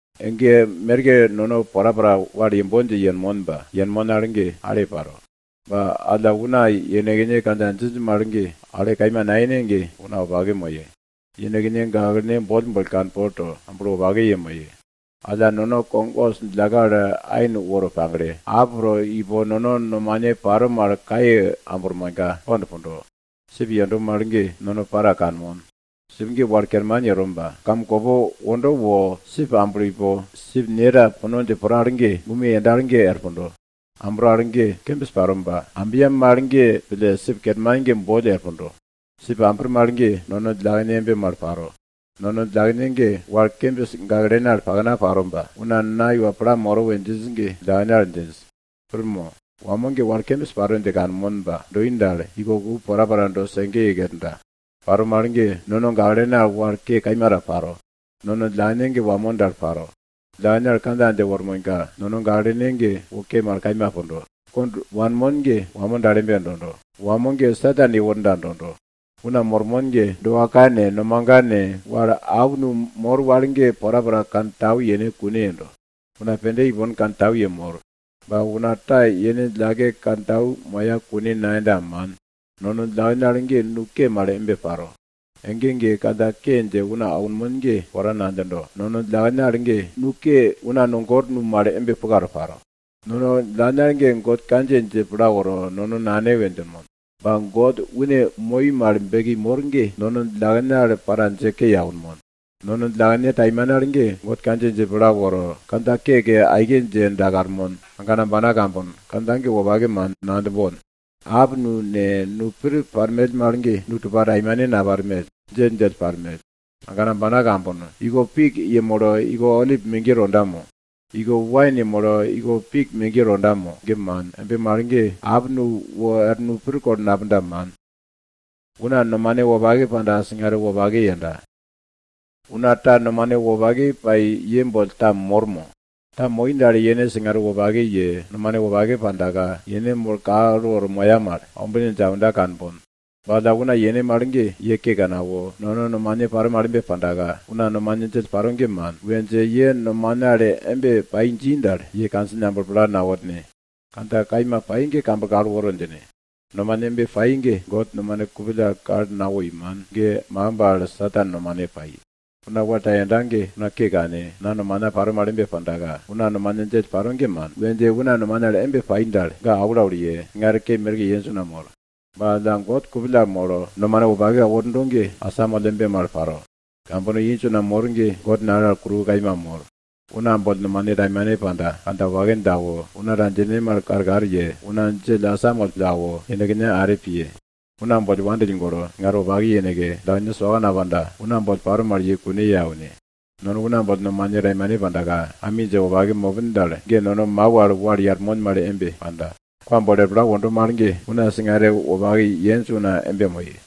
Ege merke nono porapora wal yembon dje yenmon ba yenmon al ge, ale paro. Ba alla una yenekne kandja djinj mal ge ale kaima nayene ge, una wopake moye. Yenekne gaklene boll boll ge kanpol to, amblo wopake yemoye. Alla nono kog os djillakne al ain woro pagle, ap to ipo nono nomane paro mal kaiye ambirmonka, kond pundo. Sip yendo mal ge, nono para kanmon, sip ge wal kerman yero ba kamkopo wondo wo sip to ipo sip ne ta puno dje pro al ge, gume to worda al ge er pundo. Ambro al ge kembis paro ba alla ambya mal pille sip kerman ge boll er pundo. Sip ambir mal ge, nono djillakene embe mal paro. Nono djillakene ge wal kembis gaklene al pakna paro ba, una na iwa pla moro we djinj ge djillakene al djinj. Pir mo? Wamo ge wal kembis paro dje kanmon ba doi dal, iko ku porapora do sege ye kerda. Paro mal ge, nono gaklene al wal ke kaima ta paro. Nono djillakene ge wamo dal paro. Djillakene al kandja dje wormonka, nono gaklene ge wo ke mal kaima pundo, kond wanmon ge wamo dal embe dondo, wamo ge Satan yeworda dondo. Una mormon ge doa ka ne, nomaga ne, wal nusolwara mor wal ge porapora kantau yene kune yendo. Una pende ipon kantau yemor. Ba una ta yene djillake kantau moya kune nayenda, man. Nono djillakene al ge nu ke mal embe paro. Ege ege kandja ke dje una aunmon ge pora nadjindo. Nono djillakene al ge nu ke una no gor nu mal embe puka to paro. Nono djillakene al ge God kandjiye dje pla woro, nono Nane we djinmon. Ba God une moi mal beki mor una ge, nono djillakene al, para dje ke ye aunmon. Nono djillakene taimane al ge God kandjiye dje pla woro, kandja keke aike dje dakarmon. Agana ambana kambono, kandja ge wopake man, nadjimbon. Nusolwara ne, nu pir parmell ge, nu tupa taimane naparmell, djelldjell parmell. Agana ambana kambono, iko pik yemolo iko olip megiye tonda mo? Iko wain yemolo iko pik megiye tonda mo? Ge man, embe mal ge, nusolwara wor nu pir kulo napunda, man. Una nomane wopake pai una ta ye boll mor mo? Ta moi dal, yene singare wopake ye, nomane wopake pandaka, yene molo kal woro moya mal ombine dje aunda kanbon. Ba alla una yene mal ge, ye ke kane awo, nono nomane paro mal embe pandaka, una nomane djell paro ge man, we dje ye nomane al embe pa dji dal, ye kandjine amblo pla naworne, kandja kaima pai ge kamblo kal woro djine. Nomane embe paro ge, God nomane kupill al kal nawoi, man. Ge makimb al Satan nomane pai. Una wal ta yenda ge, una ke kane, na nomana paro mal embe pandaka, una nomane djell paro ge man, we dje una nomane al embe pai dal, ga aulaul ye, singare ke merke yenj una mor. Ba alla God kupill al molo nomane wopake awo wordo ge, asamoll embe mal paro. Kambono inj una mor ge God nale al kuruwo kaima mor. Una boll nomane taimane panda, kandja wopake dje awo, una ta kandja djine mal karkar ye, una djell asamoll pille awo, yenekne are piye. Una boll wandill golo, singare wopake yeneke, djillakene soka napandaka, una boll paro mal ye kune ye aune. Nono una boll nomane taimane pandaka, ami dje wopake mopin dal, ge nono mau al wal yarmon mal embe panda. Kwa bolo er pla wondo mal ge, una singare wopake yenj una embe moye.